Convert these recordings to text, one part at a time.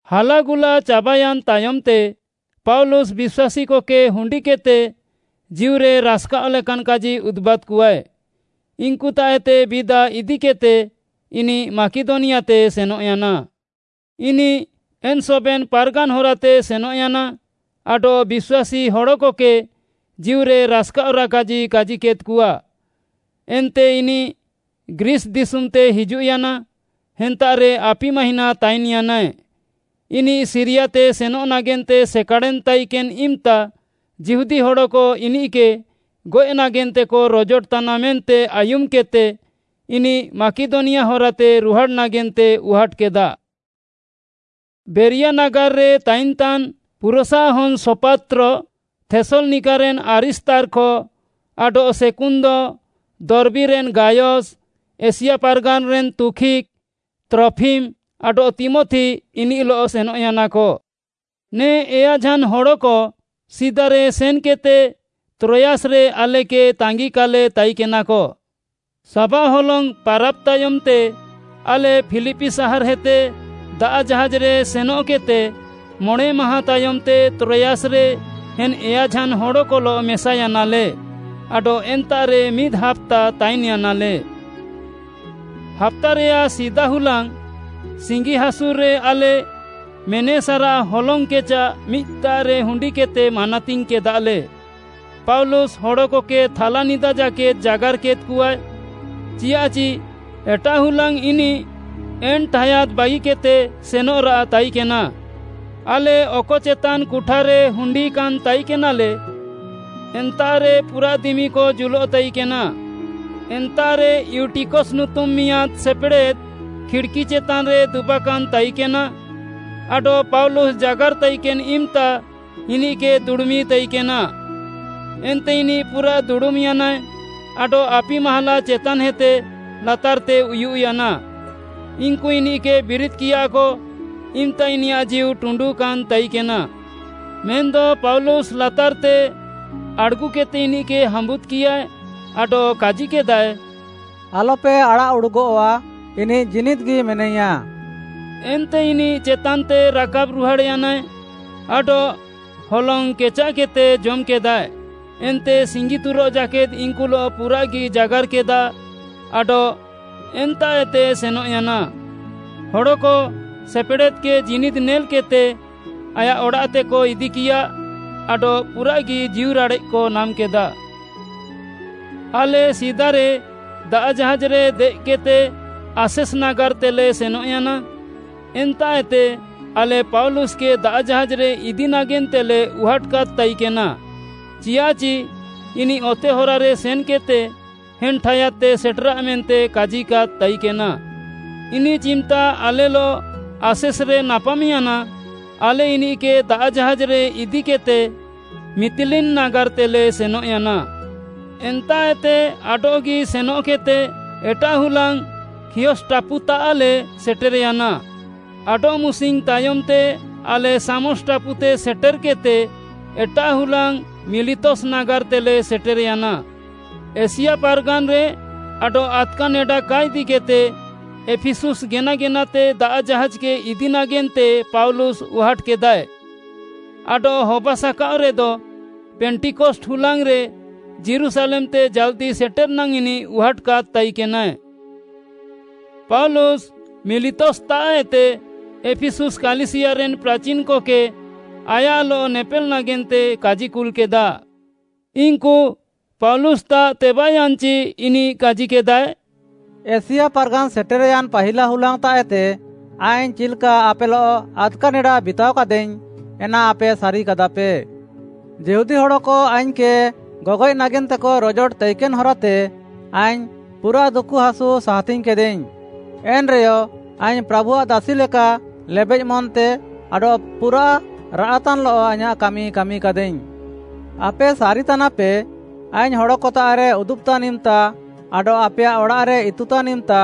ହାଲାଗୁଲା ଚାବାୟାନ୍‌ ତାୟମ୍‌ତେ, ପାଉଲୁସ୍‌ ବିଶ୍ୱାସୀକକେ ହୁଣ୍ଡିକେଦ୍‌ତେ ଜୀଉରେ ରାସ୍‌କାଅଃ ଲେକାନ୍‌ କାଜି ଉଦୁବାଦ୍‌କଆଏ। ଇନ୍‌କୁତାଃଏତେ ବିଦା ଇଦିକେଦ୍‌ତେ ଇନିଃ ମାକିଦନିଆତେ ସେନଃୟାନା। ଇନିଃ ଏନ୍‌ ସବେନ୍‌ ପାର୍‌ଗାନ୍‌ ହରାତେ ସେନଃୟାନା ଆଡଃ ବିଶ୍ୱାସୀ ହଡ଼କକେ ଜୀଉରେ ରାସ୍‌କାଅଃରାଃ କାଜି କାଜିକେଦ୍‌କଆ। ଏନ୍ତେ ଇନିଃ ଗ୍ରୀସ୍‌ ଦିଶୁମ୍‌ତେ ହିଜୁଃୟାନା, ଏନ୍ତାଃରେ ଆପି ମାହିଁନା ତାଇନ୍‌ୟାନାଏ। ଇନିଃ ସିରିୟାତେ ସେନଃ ନାଗେନ୍ତେ ସେକାଡ଼େନ୍‌ ତାଇକେନ୍‌ ଇମ୍‌ତା ଯିହୁଦୀ ହଡ଼କ ଇନିକେ ଗଏଃ ନାଗେନ୍ତେକ ରୋଜୋଟତାନା ମେନ୍ତେ ଆୟୁମ୍‌କେଦ୍‌ତେ ଇନିଃ ମାକିଦନିଆ ହରାତେ ରୁହାଡ଼୍‌ ନାଗେନ୍ତେ ଉହାଟ୍‌କେଦା। ବେରିଆ ନାଗାର୍‌ରେ ତାଇନ୍‌ତାନ୍‌ ପୁରସ୍‌ଆଃ ହନ୍‌ ସୋପାତ୍ର, ଥେସ୍‌ଲନିକାରେନ୍‌ ଆରିସ୍ତାର୍ଖ ଆଡଃ ସେକୁନ୍ଦ, ଦର୍ବୀରେନ୍‌ ଗାୟସ୍‌, ଏସିଆ ପାର୍‌ଗାନ୍‌ରେନ୍‌ ତୁଖିକ୍‌, ତ୍ରଫିମ୍‌ ଆଡଃ ତୀମଥି ଇନିଃଲଃ ସେନଃୟାନାକ। ନେ ଏୟାଝାନ୍‌ ହଡ଼କ ସିଦାରେ ସେନ୍‌କେଦ୍‌ତେ ତ୍ରୋୟାସ୍‌ରେ ଆଲେକେ ତାଙ୍ଗିକାଲେ ତାଇକେନାକ। ସାବାଃ ହଲଙ୍ଗ୍‌ ପାରାବ୍‌ ତାୟମ୍‌ତେ ଆଲେ ଫିଲିପି ସାହାର୍‌ଏତେ ଦାଆଃ ଜାହାଜ୍‌ରେ ସେନଃକେଦ୍‌ତେ ମଣେଁମାହାଁ ତାୟମ୍‌ତେ ତ୍ରୋୟାସ୍‌ରେ ଏନ୍‌ ଏୟାଝାନ୍‌ ହଡ଼କଲଃ ମେସାୟାନାଲେ ଆଡଃ ଏନ୍ତାଃରେ ମିଦ୍‌ ହାପ୍ତା ତାଇନ୍‌ୟାନାଲେ। ହାପ୍ତାରେୟାଃ ସିଦା ହୁଲାଙ୍ଗ୍‌ ସିଙ୍ଗିହାସୁର୍‌ରେ ଆଲେ ମେନେସାରାଃ ହଲଙ୍ଗ୍‌ କେଚାଃ ମିଦ୍‌ତାଃରେ ହୁଣ୍ଡିକେଦ୍‌ତେ ମାନାତିଙ୍ଗ୍‌କେଦାଲେ। ପାଉଲୁସ୍‌ ହଡ଼କକେ ଥାଲାନିଦା ଜାକେଦ୍‌ ଜାଗାର୍‌କେଦ୍‌କଆଏ, ଚିଆଃଚି ଏଟାଃ ହୁଲାଙ୍ଗ୍‌ ଇନିଃ ଏନ୍‌ ଠାୟାଦ୍‌ ବାଗିକେଦ୍‌ତେ ସେନଃରାଃ ତାଇକେନା। ଆଲେ ଅକ ଚେତାନ୍‌ କୁଠାରେ ହୁଣ୍ଡିକାନ୍‌ ତାଇକେନାଲେ, ଏନ୍ତାଃରେ ପୁରାଃ ଦିମିକ ଜୁଲଃତାଇକେନା। ଏନ୍ତାଃରେ ଇଉଟିକସ୍‌ ନୁତୁମ୍‌ ମିଆଁଦ୍‌ ସେପେଡ଼େଦ୍‌ ଖିଡ଼୍‌କି ଚେତାନ୍‌ରେ ଦୁବାକାନ୍‌ ତାଇକେନା ଆଡଃ ପାଉଲୁସ୍‌ ଜାଗାର୍‌ ତାଇକେନ୍‌ ଇମ୍‌ତା ଇନିଃକେ ଦୁଡ଼ୁମିତାଇକେନା। ଏନ୍ତେ ଇନିଃ ପୁରା ଦୁଡ଼ୁମ୍‌ୟାନାଏ ଆଡଃ ଆପି ମାହାଲା ଚେତାନ୍‌ହେତେ ଲାତାର୍‌ରେ ଉୟୁଃୟାନା। ଇନ୍‌କୁ ଇନିଃକେ ବିରିଦ୍‌କିୟାକ ଇମ୍‌ତା ଇନିୟାଃ ଜୀଉ ଟୁଣ୍ଡୁକାନ୍‌ ତାଇକେନା। ମେନ୍‌ଦ ପାଉଲୁସ୍‌ ଲାତାର୍‌ତେ ଆଡ଼୍‌ଗୁକେଦ୍‌ତେ ଇନିଃକେ ହାମ୍ବୁଦ୍‌କିୟାଏ ଆଡଃ କାଜିକେଦାଏ, “ଆଲପେ ଆଡ଼ାଃଉଡ଼ୁଗଃଆ, ଇନିଃ ଜୀନିଦ୍‌ଗି ମେନାଇୟା।” ଏନ୍ତେ ଇନିଃ ଚେତାନ୍‌ତେ ରାକାବ୍‌ ରୁହାଡ଼୍‌ୟାନାଏ ଆଡଃ ହଲଙ୍ଗ୍‌ କେଚାଃକେଦ୍‍ତେ ଜମ୍‍କେଦାଏ, ଏନ୍ତେ ସିଙ୍ଗିତୁରଃ ଜାକେଦ୍‌ ଇନ୍‌କୁଲଃ ପୁରାଃଗି ଜାଗାର୍‌କେଦା ଆଡଃ ଏନ୍ତାଃଏତେ ସେନଃୟାନା। ହଡ଼କ ସେପେଡ଼େଦ୍‌କେ ଜୀନିଦ୍‌ ନେଲ୍‌କେଦ୍‌ତେ ଆୟାଃ ଅଡ଼ାଃତେକ ଇଦିକିୟା ଆଡଃ ପୁରାଃଗି ଜୀଉରାଡ଼େଃକ ନାମ୍‌କେଦା। ଆଲେ ସିଦାରେ ଦାଆଃ ଜାହାଜ୍‌ରେ ଦେଏଃକେଦ୍‌ତେ ଆସେସ୍‌ ନାଗାର୍‌ତେଲେ ସେନଃୟାନା। ଏନ୍ତାଃଏତେ ଆଲେ ପାଉଲୁସ୍‌କେ ଦାଆଃ ଜାହାଜ୍‌ରେ ଇଦି ନାଗେନ୍ତେଲେ ଉହାଟ୍‌କାଦ୍‌ ତାଇକେନା, ଚିଆଃଚି ଇନିଃ ଅତେ ହରାରେ ସେନ୍‌କେଦ୍‌ତେ ଏନ୍‌ ଠାୟାଦ୍‌ତେ ସେଟେରା ମେନ୍ତେ କାଜିକାଦ୍‌ ତାଇକେନା। ଇନିଃ ଚିମ୍‌ତା ଆଲେଲଃ ଆସେସ୍‌ରେ ନାପାମ୍‌ୟାନା, ଆଲେ ଇନିଃକେ ଦାଆଃ ଜାହାଜ୍‌ରେ ଇଦିକେଦ୍‌ତେ ମିତିଲିନ୍‌ ନାଗାର୍‌ତେଲେ ସେନଃୟାନା। ଏନ୍ତାଃଏତେ ଆଡଃଗି ସେନଃକେଦ୍‌ତେ ଏଟାଃ ହୁଲାଙ୍ଗ୍‌ ଖିଅସ୍‌ ଟାପୁତାଃଲେ ସେଟେର୍‌ୟାନା। ଆଡଃମୁସିଙ୍ଗ୍‌ ତାୟମ୍‌ତେ ଆଲେ ସାମସ୍‌ ଟାପୁତେ ସେଟେର୍‌କେଦ୍‌ତେ, ଏଟାଃ ହୁଲାଙ୍ଗ୍‌ ମିଲିତସ୍‌ ନାଗାର୍‌ତେଲେ ସେଟେର୍‌ୟାନା। ଏସିଆ ପାର୍‌ଗାନ୍‌ରେ ଆଡଃ ଆଦ୍‌କା ନେଡା କା ଇଦିକେଦ୍‌ତେ ଏଫିସୁସ୍‌ ଗେନା ଗେନାତେ ଦାଆଃ ଜାହାଜ୍‌କେ ଇଦି ନାଗେନ୍ତେ ପାଉଲୁସ୍‌ ଉହାଟ୍‌କେଦାଏ। ଆଡଃ ହବାସାକାଅଃରେଦ, ପେଣ୍ଟିକଷ୍ଟ୍‌ ହୁଲାଙ୍ଗ୍‌ରେ ଯୀରୁଶାଲେମ୍‌ତେ ଜାଲ୍‌ଦି ସେଟେର୍‌ ନାଙ୍ଗ୍‌ ଇନିଃ ଉହାଟ୍‌କାଦ୍‌ ତାଇକେନାଏ। ପାଉଲୁସ୍‌ ମିଲିତସ୍‌ତାଃଏତେ ଏଫିସୁସ୍‌ କାଲିସିୟାରେନ୍‌ ପ୍ରାଚିନ୍‌କକେ ଆୟାଃଲଃ ନେପେଲ୍‌ ନାଗେନ୍ତେ କାଜିକୁଲ୍‌କେଦା। ଇନ୍‌କୁ ପାଉଲୁସ୍‌ତାଃ ତେବାଃୟାନ୍‌ଚି ଇନିଃ କାଜିକେଦାଏ, “ଏସିଆ ପାର୍‌ଗାନ୍‌ ସେଟେର୍‌ୟାନ୍‌ ପାହିଲା ହୁଲାଙ୍ଗ୍‌ତାଃଏତେ ଆଇଙ୍ଗ୍‌ ଚିଲ୍‌କା ଆପେଲଃ ଆଦ୍‌କା ନେଡା ବିତାଅକାଦାଇଙ୍ଗ୍‌, ଏନା ଆପେ ସାରିକାଦାପେ। ଯିହୁଦୀ ହଡ଼କ ଆଇଙ୍ଗ୍‌କେ ଗଗଏଃ ନାଗେନ୍ତେକ ରୋଜୋଟ ତାଇକେନ୍‌ ହରାତେ ଆଇଙ୍ଗ୍‌ ପୁରାଃ ଦୁକୁହାସୁ ସାହାତିଙ୍ଗ୍‌କେଦାଇଙ୍ଗ୍‌, ଏନ୍‌ରେୟ ଆଇଙ୍ଗ୍‌ ପ୍ରାଭୁଆଃ ଦାସି ଲେକା ଲେବେଃ ମନ୍‌ତେ ଆଡଃ ପୁରାଃ ରାଆଃତାନ୍‌ଲଃ ଆଇଁୟାଃ କାମି କାମିକାଦାଇଙ୍ଗ୍‌। ଆପେ ସାରିତାନାପେ, ଆଇଙ୍ଗ୍‌ ହଡ଼କତାଃରେ ଉଦୁବ୍‌ତାନ୍‌ ଇମ୍‌ତା ଆଡଃ ଆପେୟାଃ ଅଡ଼ାଃରେ ଇତୁତାନ୍‌ ଇମ୍‌ତା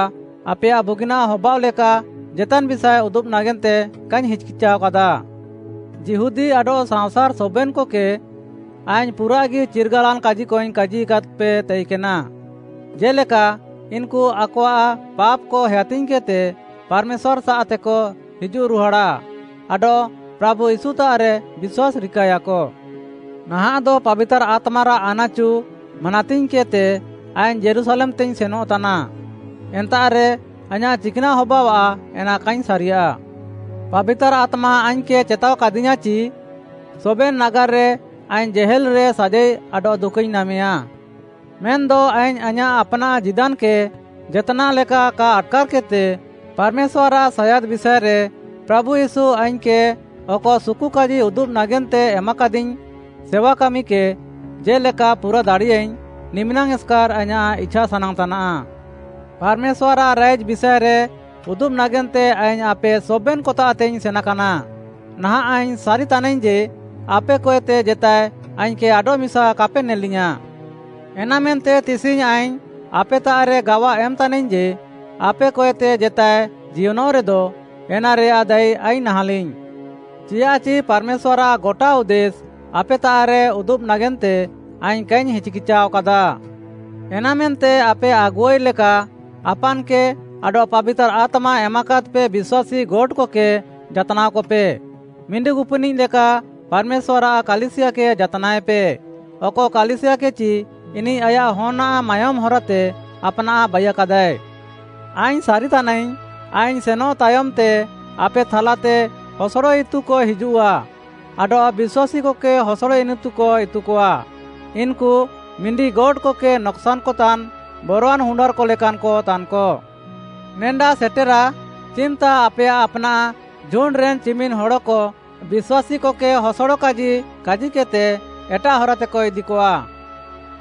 ଆପେୟାଃ ବୁଗିନାଃ ହବାଅଃ ଲେକା ଜେତାନ୍‌ ବିଷାଏ ଉଦୁବ୍‌ ନାଗେନ୍ତେ କାଇଙ୍ଗ୍‌ ହିଚ୍‌କିଚାଅକାଦା। ଯିହୁଦୀ ଆଡଃ ସାଅଁସାର୍‌ ସବେନ୍‌କକେ ଆଇଙ୍ଗ୍‌ ପୁରାଃଗି ଚିର୍ଗାଲାନ୍‌ କାଜିକଇଙ୍ଗ୍‌ କାଜିକାଦ୍‌ପେ ତାଇକେନା, ଜେ'ଲେକା ଇନ୍‌କୁ ଆକଆଃ ପାପ୍‌କ ହେୟାତିଙ୍ଗ୍‌କେଦ୍‌ତେ ପାର୍‌ମେଶ୍ୱାର୍‌ସାଃତେକ ହିଜୁଃରୁହାଡ଼ା ଆଡଃ ପ୍ରାଭୁ ୟୀଶୁତାଃରେ ବିଶ୍ୱାସ୍‌ ରିକାଏୟାକ। ନାହାଃଁଦ ପାବିତାର୍‌ ଆତ୍ମାରାଃ ଆନାଚୁ ମାନାତିଙ୍ଗ୍‌କେଦ୍‌ତେ ଆଇଙ୍ଗ୍‌ ଯୀରୁଶାଲେମ୍‌ତେଇଙ୍ଗ୍‌ ସେନଃତାନା, ଏନ୍ତାଃରେ ଆଇଁୟାଃ ଚିକ୍‌ନାଃ ହବାଅଃଆ ଏନା କାଇଙ୍ଗ୍‌ ସାରିୟା। ପାବିତାର୍‌ ଆତ୍ମା ଆଇଙ୍ଗ୍‌କେ ଚେତାଅକାଦିୟାଁ ଚି, ସବେନ୍‌ ନାଗାର୍‌ରେ ଆଇଙ୍ଗ୍‌ ଜେହେଲ୍‌ରେ ସାଜାଇ ଆଡଃ ଦୁକୁଇଙ୍ଗ୍‌ ନାମେୟା। ମେନ୍‌ଦ ଆଇଙ୍ଗ୍‌ ଆଇଁୟାଃ ଆପ୍‌ନାଃ ଜୀଦାନ୍‌କେ ଜେତ୍‌ନାଃ ଲେକା କା ଆଟ୍‌କାର୍‌କେଦ୍‌ତେ, ପାର୍‌ମେଶ୍ୱାର୍‌ଆଃ ସାୟାଦ୍‌ ବିଷାଏରେ ପ୍ରାଭୁ ୟୀଶୁ ଆଇଙ୍ଗ୍‌କେ ଅକ ସୁକୁକାଜି ଉଦୁବ୍‌ ନାଗେନ୍ତେ ଏମାକାଦିଙ୍ଗ୍‌ ସେୱାକାମିକେ ଜେ'ଲେକା ପୁରା ଦାଡ଼ିୟାଇଙ୍ଗ୍‌, ନିମିନାଙ୍ଗ୍‌ ଏସ୍‌କାର୍‌ ଆଇଁୟାଃ ଇଛାସାନାଙ୍ଗ୍‌ ତାନାଃ। “ପାର୍‌ମେଶ୍ୱାର୍‌ଆଃ ରାଇଜ୍‌ ବିଷାଏରେ ଉଦୁବ୍‌ ନାଗେନ୍ତେ ଆଇଙ୍ଗ୍‌ ଆପେ ସବେନ୍‌କତାଃତେଇଙ୍ଗ୍‌ ସେନାକାନା। ନାହାଁଃ ଆଇଙ୍ଗ୍‌ ସାରିତାନାଇଙ୍ଗ୍‌ ଯେ, ଆପେକଏତେ ଜେତାଏ ଆଇଙ୍ଗ୍‌କେ ଆଡଃମିସା କାପେ ନେଲିୟାଁ। ଏନାମେନ୍ତେ ତିସିଙ୍ଗ୍‌ ଆଇଙ୍ଗ୍‌ ଆପେତାଃରେ ଗାୱା ଏମ୍‌ତାନାଇଙ୍ଗ୍‌ ଯେ, ଆପେକଏତେ ଜେତାଏ ଜିୟନଃରେଦ ଏନାରେୟାଃ ଦାୟୀ ଆଇଙ୍ଗ୍‌ ନାହାଁଲିଙ୍ଗ୍‌। ଚିଆଃଚି ପାର୍‌ମେଶ୍ୱାର୍‌ଆଃ ଗଟା ଉଦ୍ଦେଶ୍‌ ଆପେତାଃରେ ଉଦୁବ୍‌ ନାଗେନ୍ତେ ଆଇଙ୍ଗ୍‌ କାଇଙ୍ଗ୍‌ ହିଚ୍‌କିଚାଅକାଦା। ଏନାମେନ୍ତେ ଆପେ ଆଗୁଆଇ ଲେକା ଆପାନ୍‌କେ ଆଡଃ ପାବିତାର୍‌ ଆତ୍ମା ଏମାକାଦ୍‌ପେ ବିଶ୍ୱାସୀ ଗୋଟ୍‌ କକେ ଯାତ୍‌ନାଅକପେ। ମିଣ୍ଡିଗୁପିନିଃ ଲେକା ପାର୍‌ମେଶ୍ୱାର୍‌ଆଃ କାଲିସିୟାକେ ଯାତ୍‌ନାଏପେ। ଅକ କାଲିସିୟାକେଚି ଇନିଃ ଆୟାଃ ହନ୍‌ଆଃ ମାୟୋମ୍‌ ହରାତେ ଆପ୍‌ନାଃ ବାଇୟାକାଦାଏ। ଆଇଙ୍ଗ୍‌ ସାରିତାନାଇଙ୍ଗ୍‌, ଆଇଙ୍ଗ୍‌ ସେନଃ ତାୟମ୍‌ତେ ଆପେ ଥାଲାତେ ହସଡ଼ ଇତୁକ ହିଜୁଃଆ ଆଡଃ ବିଶ୍ୱାସୀକକେ ହସଡ଼ ଇନିତୁକ ଇତୁକଆ। ଇନ୍‌କୁ ମିଣ୍ଡିଗୋଟ୍‌କେ ନକ୍‌ସାନ୍‌କତାନ୍‌ ବରୱାନ୍‌ ହୁଣ୍ଡାର୍‌କ ଲେକାନ୍‌କ ତାନ୍‌କ। ନେଡା ସେଟେରା, ଚିମ୍‌ତା ଆପେୟାଃ ଆପ୍‌ନାଃ ଝୁଣ୍ଡ୍‌ରେନ୍‌ ଚିମିନ୍‌ ହଡ଼କ ବିଶ୍ୱାସୀକକେ ହସଡ଼ କାଜି କାଜିକେଦ୍‌ତେ ଏଟାଃ ହରାତେକ ଇଦିକଆ।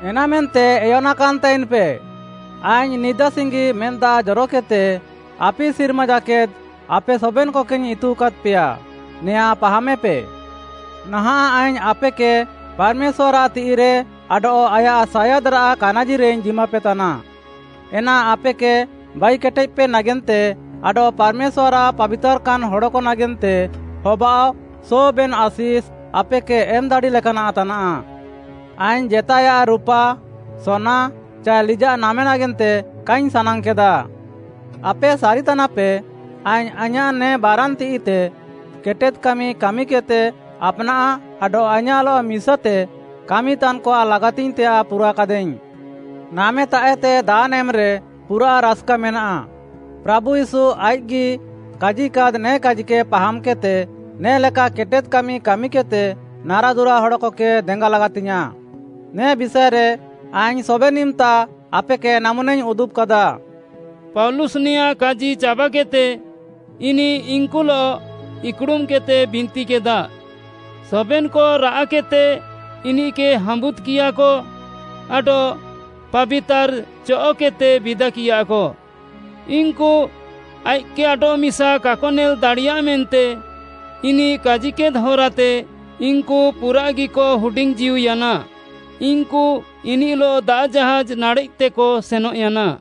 ଏନାମେନ୍ତେ ଏୟନାକାନ୍‌ ତାଇନ୍‌ପେ, ଆଇଙ୍ଗ୍‌ ନିଦା ସିଙ୍ଗି ମେଦ୍‌ ଦାଆଃ ଜରକେଦ୍‌ତେ ଆପି ସିର୍ମା ଜାକେଦ୍‌ ଆପେ ସବେନ୍‌କକେଇଙ୍ଗ୍‌ ଇତୁକାଦ୍‌ପେୟା, ନେୟାଁ ପାହାମେପେ। “ନାହାଁଃ ଆଇଙ୍ଗ୍‌ ଆପେକେ ପାର୍‌ମେଶ୍ୱାର୍‌ଆଃ ତିଃଇରେ ଆଡଃ ଆୟାଃ ସାୟାଦ୍‌ରାଃ କାନାଜିରେଇଙ୍ଗ୍‌ ଜିମାପେତାନା, ଏନା ଆପେକେ ବାଇକେଟେଦ୍‌ପେ ନାଗେନ୍ତେ ଆଡଃ ପାର୍‌ମେଶ୍ୱାର୍‌ଆଃ ପାବିତାର୍‌କାନ୍‌ ହଡ଼କ ନାଗେନ୍ତେ ହବାଅଃ ସବେନ୍‌ ଆଶିଷ୍‌, ଆପେକେ ଏମ୍‌ ଦାଡ଼ି ଲେକାନାଃ ତାନାଃ। ଆଇଙ୍ଗ୍‌ ଜେତାଏୟାଃ ରୁପା, ସୋନା ଚାଏ ଲିଜାଃ ନାମେ ନାଗେନ୍ତେ କାଇଙ୍ଗ୍‌ ସାନାଙ୍ଗ୍‌କେଦା। ଆପେ ସାରିତାନାପେ, ଆଇଙ୍ଗ୍‌ ଆଇଁୟାଃ ନେ ବାରାନ୍‌ ତିଃଇତେ କେଟେଦ୍‌ କାମି କାମିକେଦ୍‌ତେ ଆପ୍‌ନାଃ ଆଡଃ ଆଇଁୟାଃଲଃ ମିସାତେ କାମିତାନ୍‌କଆଃ ଲାଗାତିଙ୍ଗ୍‌ତେୟାଃ ପୁରାକାଦାଇଙ୍ଗ୍‌। ‘ନାମେତାଃଏତେ ଦାନ୍‌ ଏମ୍‌ରେ ପୁରାଃ ରାସ୍‌କାମେନାଃ,’ ପ୍ରାଭୁ ୟୀଶୁ ଆଇଃକ୍‌ଗି କାଜିକାଦ୍‌ ନେ କାଜିକେ ପାହାମ୍‌କେଦ୍‌ତେ, ନେ'ଲେକା କେଟେଦ୍‌ କାମି କାମିକେଦ୍‌ତେ ନାରାଦୁରା ହଡ଼କକେ ଦେଙ୍ଗା ଲାଗାତିଙ୍ଗ୍‌ୟାଁଃ, ନେ ବିଷାଏରେ ଆଇଙ୍ଗ୍‌ ସବେନ୍‌ ଇମ୍‌ତା ଆପେକେ ନାମୁନାଇଙ୍ଗ୍‌ ଉଦୁବ୍‌କାଦା।” ପାଉଲୁସ୍‌ ନେଆଁଁ କାଜି ଚାବାକେଦ୍‌ତେ, ଇନିଃ ଇନ୍‌କୁଲଃ ଇକ୍‌ଡ଼ୁମ୍‌କେଦ୍‌ତେ ବିନ୍ତିକେଦା। ସବେନ୍‌କ ରାଆଃକେଦ୍‌ତେ ଇନିଃକେ ହାମ୍ବୁଦ୍‌କିୟାକ ଆଡଃ ପାବିତାର୍‌ ଚଅଃକେଦ୍‌ତେ ବିଦାକିୟାକ। ଇନ୍‌କୁ ଆଇଃକ୍‌କେ ଆଡଃମିସା କାକ ନେଲ୍‌ ଦାଡ଼ିୟା ମେନ୍ତେ ଇନିଃ କାଜିକେଦ୍‌ ହରାତେ ଇନ୍‌କୁ ପୁରାଃଗିକ ହୁଡିଙ୍ଗ୍‌ ଜୀଉୟାନା। ଇନ୍‌କୁ ଇନିଃଲଃ ଦାଆଃ ଜାହାଜ୍‌ ନାଡ଼େଃତେକ ସେନଃୟାନା।